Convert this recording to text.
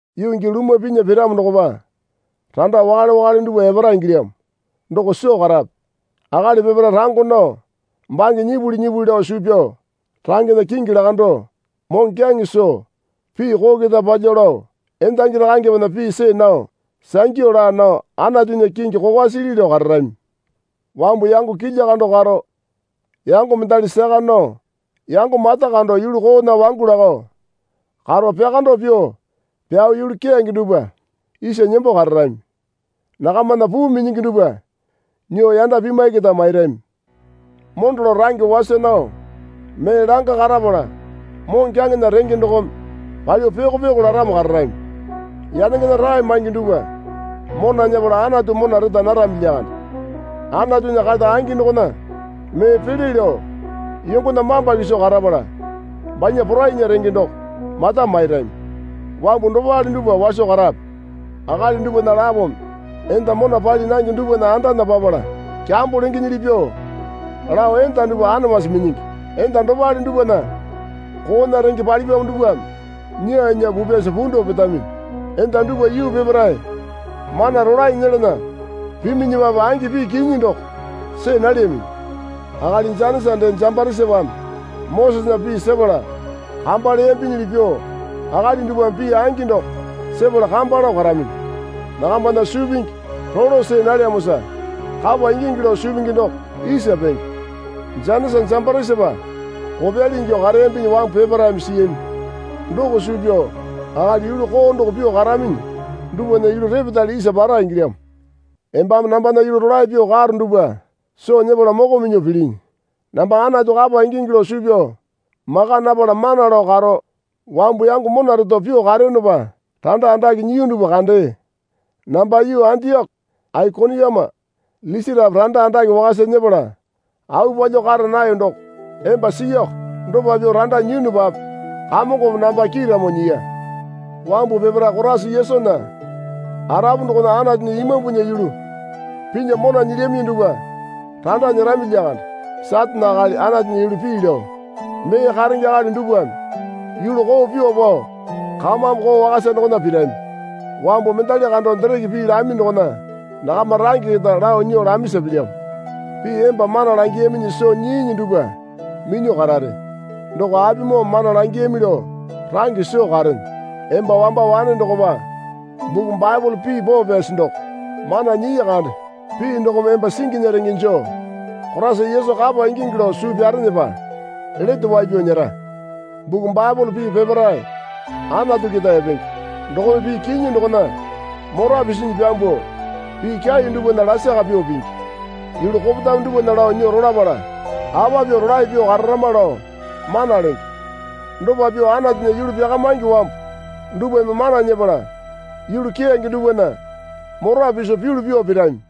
Yuu gii lumwa pinya piramo dokopa randa wakale wakale dupwa epara ingilyamo doko soo karape. Akali peparae rango nao bange nyipuli nyipuli lao suu pyao rangena kingi lakando moŋokyaŋe soo pii koo keta palyuo lao endangi rakangepena pii see nao sangyu laa nao Anatunya kingi kokwa sili lao kararami. Wambu yango kilya kando karo yango mendali saka nao yango mata kando yulu koona wangu lako karo pyakando pyuo pyao yulu keyange dupwa isa nembo kararami. Nakamana puu minyingi dupwa nyuo yanda pimwai keta mairami. Mondo lao range wasa nao mee langa karapala moŋokyaŋena renge dokome palyuo pyoko pyoko laramo kararami. Yanengena rae maingi dupwa mona nyepala Anatu mona reta narami lyakande. Anatunya kata angi dokona mee pele lao yongona mamba kiso karapala banya porainya renge doko mata mairami. Wambu dopale dupwa waso karape. Akali dupwana lapome enda mona pali nange dupwana andana papala kyambo lengenyili pyuo lao enda dupwa anamasi minyingi. Enda dopale dupwana koona renge palipyamo dupwame nyaa nyaa pupyasa punduo petaminyi. Enda dupwa yuu peparae mana rolae nyelana piminyipape angi pii kinyi doko see nalyaminyi. Akali Janisa dee Jambarisapame Mosesena pii sepala kamba leyambinyili pyuo akali dupwame pii angi doko sepala kamba lao karaminyi. Nakambana suu pingi rolo see nalyamosa kapa ingingi lao suu pingi doko isa penge. Janisa Jambarisapa kopyali ingyuo kareyambinyi wambu peparaeme siyami doko suu pyao akali yulu koo doko pyuo karaminyi dupwana yulu repetale isa para ingilyamo. Embame nambana yulu rolae pyuo karo dupwa soo nyepala moko minyuo pilinyi. Namba Anatu kapa ingingi lao suu pyao maka napala mana lao karo wambu yango mona reto pyuo kareyonopa randa andake nyiyu dupwa kandee. Namba yuu Andioko Aikoniuma Lisatape randa andake wakasa nyepala au palyuo kara nayo doko emba siiyako. Dopa pyuo randa nyiyunupape Kamongome namba kiiramo nyiya. Wambu peparae Koraisa Yesunya arapu dokona Anatunya Imambunya yulu pinya mona nyilyaminyi dupwa randa nyerami lyakande. Satane akali Anatunya yulu pii lao mee karenge akali dupwame yulu koo pyuo pao kamame koo wakasa dokona pirami. Wambu mendali kando dereke pii lami dokona nakama range keta lao nyuo lamisa pilyamo. Pii emba mana langiyaminyi soo nyiinyi dupwa minyuo karare. Doko apimoome mana langiyami lao range soo karene. Emba wamba wane dokopa buku Baepole pii poo pyasi doko mana nyii kande. Pii dokome emba singinya renge joo Koraisa Yesu kapa ingingi lao suu pyarenepa lete wai pyao nyera. Buku Baepole pii peparae Anatu keta epenge. Dokome pii kinyi dokona mora pisinyi pyambuo pii kyai dupwana lasaka pyuo pingi. Yulu kopetame dupwana lao nyuo rolapala apa pyuo rolae pyuo kararama lao mana lenge. Dopa pyuo Anatunya yulu pyakamaingi wambu dupwame mana nyepala yulu keyange dupwana mora piso pyulu pyuo pirami.